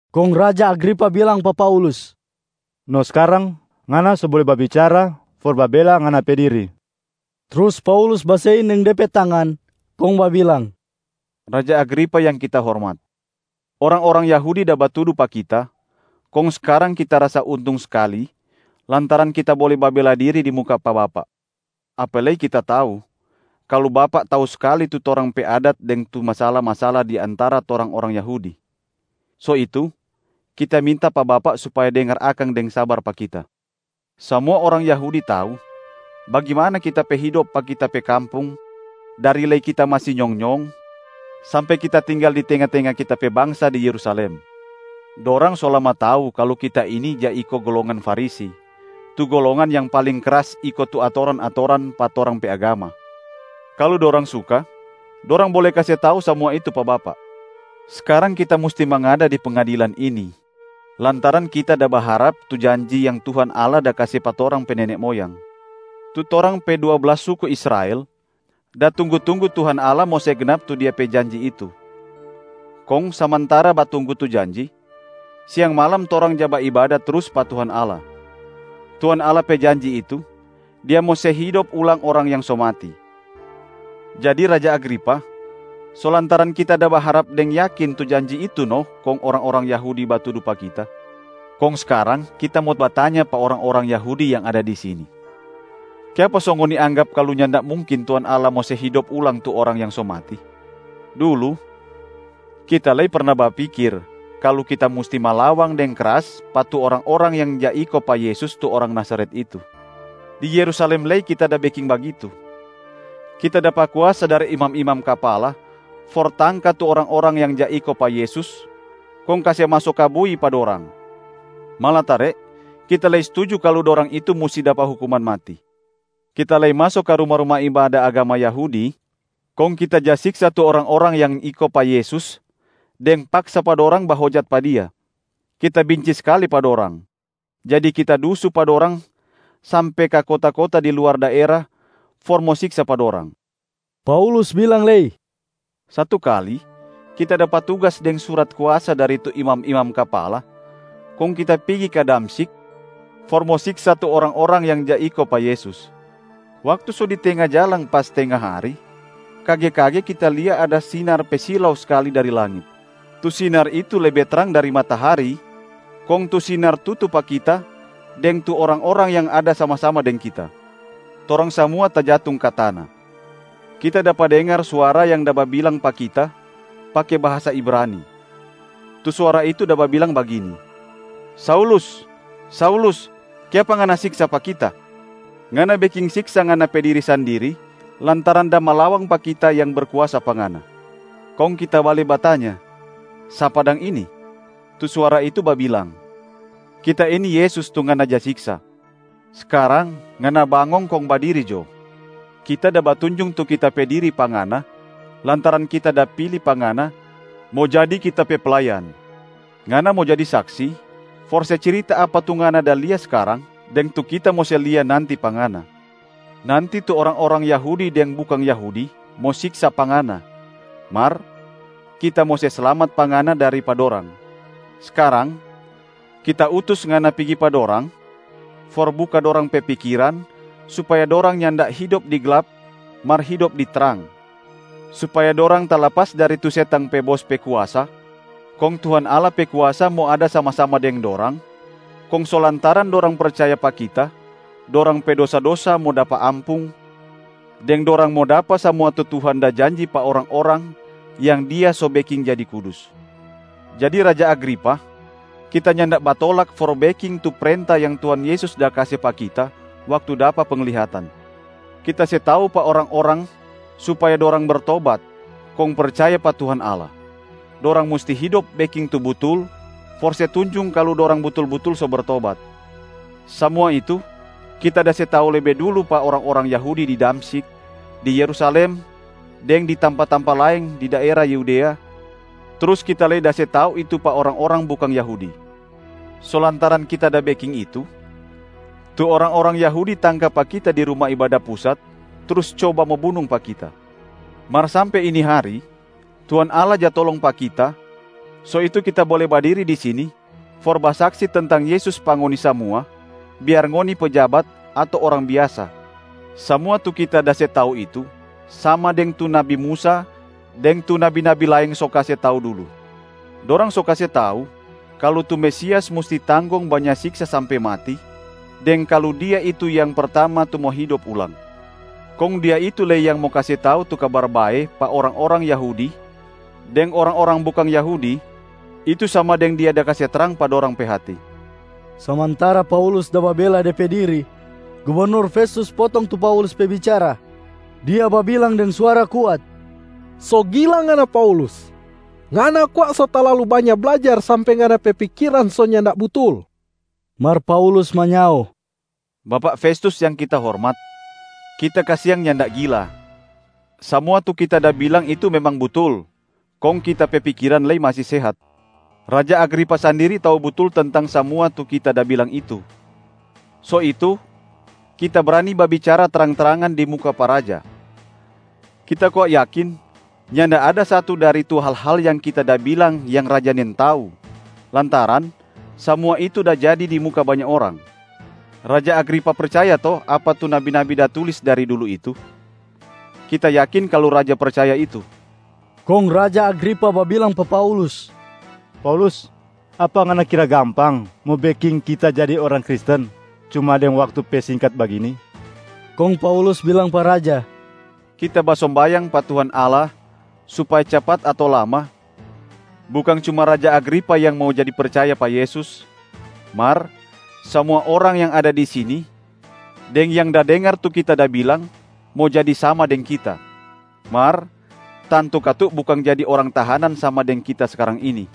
Kong raja Agripa bilang pa Paulus, “No skarang, ngana so bole babicara for babela ngana pe diri.” Trus Paulus basein deng de pe tangan kong babilang, “Raja Agripa yang kita hormat. Orang-orang Yahudi da batudu pa kita, kong skarang kita rasa untung skali lantaran kita bole babela diri di muka pa bapak. Apa lei kita tau, kalu bapak tau skali tu torang pe adat deng tu masala-masala di antara torang orang Yahudi. So itu, kita minta pa bapak supaya dengar akang deng sabar pa kita. Samua orang Yahudi tau bagimana kita pe hidop pa kita pe kampung dari lei kita masi nyong-nyong, sampe kita tinggal di tenga-tenga kita pe bangsa di Yerusalem. Dorang so lama tau kalu kita ini ja iko golongan Farisi, tu golongan yang paling kras iko tu atoran-atoran pa torang pe agama. Kalu dorang suka, dorang bole kase tau samua itu pa bapak. Skarang kita musti mangada di pengadilan ini lantaran kita da baharap tu janji yang Tuhan Allah da kase pa torang pe nene moyang. Tu torang pe dua blas suku Israel da tunggu-tunggu Tuhan Allah mo se gnap tu Dia pe janji itu. Kong samantara batunggu tu janji, siang malam torang ja baibada trus pa Tuhan Allah. Tuhan Allah pe janji itu, Dia mo se hidop ulang orang yang so mati. Jadi Raja Agripa, so lantaran kita da baharap deng yakin tu janji itu no kong orang-orang Yahudi batudu pa kita. Kong skarang kita mo batanya pa orang-orang Yahudi yang ada di sini. Kiapa so ngoni anggap kalu nyanda mungkin Tuhan Allah mo se hidop ulang tu orang yang so mati? Dulu, kita lei perna bapikir kalu kita musti malawang deng kras pa tu orang-orang yang ja iko pa Yesus, tu Orang Nazaret itu. Di Yerusalem lei kita da beking bagitu. Kita dapa kuasa dari imam-imam kapala for tangka tu orang-orang yang ja iko pa Yesus kong kase maso ka bui pa dorang, malatare kita lei stuju kalu dorang itu musti dapa hukuman mati. Kita lei maso ka ruma-ruma ibada agama Yahudi, kong kita ja siksa tu orang-orang yang iko pa Yesus deng paksa pa dorang bahojat pa Dia. Kita binci skali pa dorang, jadi kita dusu pa dorang sampe ka kota-kota di luar daera for mo siksa pa dorang.” Paulus bilang lei, “Satu kali, kita dapa tugas deng surat kuasa dari tu imam-imam kapala kong kita pigi ka Damsyik for mo siksa tu orang-orang yang ja iko pa Yesus. Waktu so di tenga jalang pas tenga hari, kage-kage kita lia ada sinar pe silau skali dari langit. Tu sinar itu lebe trang dari matahari, kong tu sinar tutu pa kita deng tu orang-orang yang ada sama-sama deng kita. Torang samua tajatung ka tana. Kita dapa dengar suara yang da babilang pa kita pake bahasa Ibrania. Tu suara itu da babilang bagini, ‘Saulus, Saulus kiapa ngana siksa pa Kita? Ngana beking siksa ngana pe diri sandiri lantaran da malawang pa Kita yang berkuasa pa ngana.’ Kong kita bale batanya, ‘Sapa dang ini?’ Tu suara itu babilang, ‘Kita ini Yesus, tu ngana ja siksa. Skarang ngana bangong kong badiri jo. Kita da batunjung tu Kita pe diri pa ngana lantaran Kita da pili pa ngana mo jadi Kita pe playan. Ngana mo jadi saksi for se cirita apa tu ngana da lia skarang deng tu Kita mo se lia nanti pa ngana. Nanti tu orang-orang Yahudi deng bukang Yahudi mo siksa pa ngana, mar Kita mo se slamat pa ngana dari pa dorang. Skarang, Kita utus ngana pigi pa dorang, for buka dorang pe pikiran supaya dorang nyanda hidop di glap mar hidop di trang, supaya dorang talapas dari tu setang pe bos pe kuasa kong Tuhan Allah pe kuasa mo ada sama-sama deng dorang, kong so lantaran dorang percaya pa Kita dorang pe dosa-dosa mo dapa ampung, deng dorang mo dapa samua tu Tuhan da janji pa orang-orang yang Dia so beking jadi kudus.’ Jadi Raja Agripa, kita nyanda batolak for beking tu prenta yang Tuhan Yesus da kase pa kita waktu dapa penglihatan. Kita se tau pa orang-orang supaya dorang bertobat kong percaya pa Tuhan Allah. Dorang musti hidop beking tu butul for se tunjung kalu dorang butul-butul so bertobat. Samua itu kita da se tau lebe dulu pa orang-orang Yahudi di Damsyik, di Yerusalem deng di tampa-tampa laeng di daera Yudea, trus kita lei da se tau itu pa orang-orang bukang Yahudi. So lantaran kita da beking itu, tu orang-orang Yahudi tangka pa kita di Ruma Ibada Pusat trus coba mo bunung pa kita. Mar sampe ini hari Tuhan Allah ja tolong pa kita, so itu kita bole badiri di sini for basaksi tentang Yesus pa ngoni samua, biar ngoni pejabat ato orang biasa. Samua tu kita da se tau itu sama deng tu nabi Musa deng tu nabi-nabi laeng so kase tau dulu. Dorang so kase tau kalu tu Mesias musti tanggong banya siksa sampe mati, deng kalu Dia itu yang pertama tu mo hidop ulang. Kong Dia itu lei yang mo kase tau tu Kabar Bae pa orang-orang Yahudi deng orang-orang bukang Yahudi, itu sama deng Dia da kase trang pa dorang pe hati.” Samantara Paulus da babela de pe diri, gubernur Festus potong tu Paulus pe bicara. Dia babilang deng suara kuat, “So gila ngana Paulus! Ngana kwa so talalu banya blajar sampe ngana pe pikiran so nyanda butul.” Mar Paulus manyao, “Bapak Festus yang kita hormat. Kita kasiang nyanda gila, samua tu kita da bilang itu memang butul, kong kita pe pikiran lei masi sehat. Raja Agripa sandiri tau butul tentang samua tu kita da bilang itu, so itu kita brani babicara trang-trangan di muka pa raja. Kita kwa yakin nyanda ada satu dari tu hal-hal yang kita da bilang yang raja nintau, lantaran samua itu da jadi di muka banya orang. Raja Agripa percaya to apa tu nabi-nabi da tulis dari dulu itu? Kita yakin kalu raja percaya itu.” Kong raja Agripa babilang pa Paulus, “Paulus, apa ngana kira gampang mo beking kita jadi orang Kristen cuma deng waktu pe singkat bagini?” Kong Paulus bilang pa raja, “Kita basombayang pa Tuhan Allah supaya capat ato lama, bukang cuma Raja Agripa yang mo jadi percaya pa Yesus, mar samua orang yang ada di sini deng yang da dengar tu kita da bilang mo jadi sama deng kita. Mar tantu katu bukang jadi orang tahanan sama deng kita skarang ini.”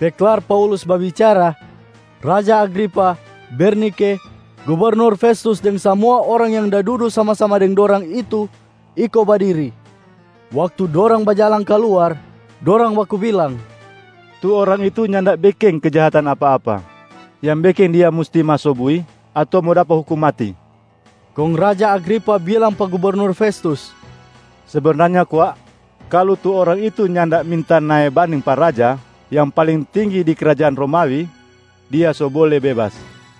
Pe klar Paulus babicara, raja Agripa, Bernike, gubernur Festus deng samua orang yang dudu sama-sama deng dorang itu iko badiri. Waktu dorang bajalang kaluar, dorang baku bilang, “Tu orang itu nyanda beking kejahatan apa-apa yang beking dia musti maso bui ato mo dapa hukum mati.” Kong raja Agripa bilang pa gubernur Festus, “Sebenarnya kwa kalu tu orang itu nyanda minta nae banding pa raja yang paling tinggi di krajaan Romawi, dia so bole bebas.”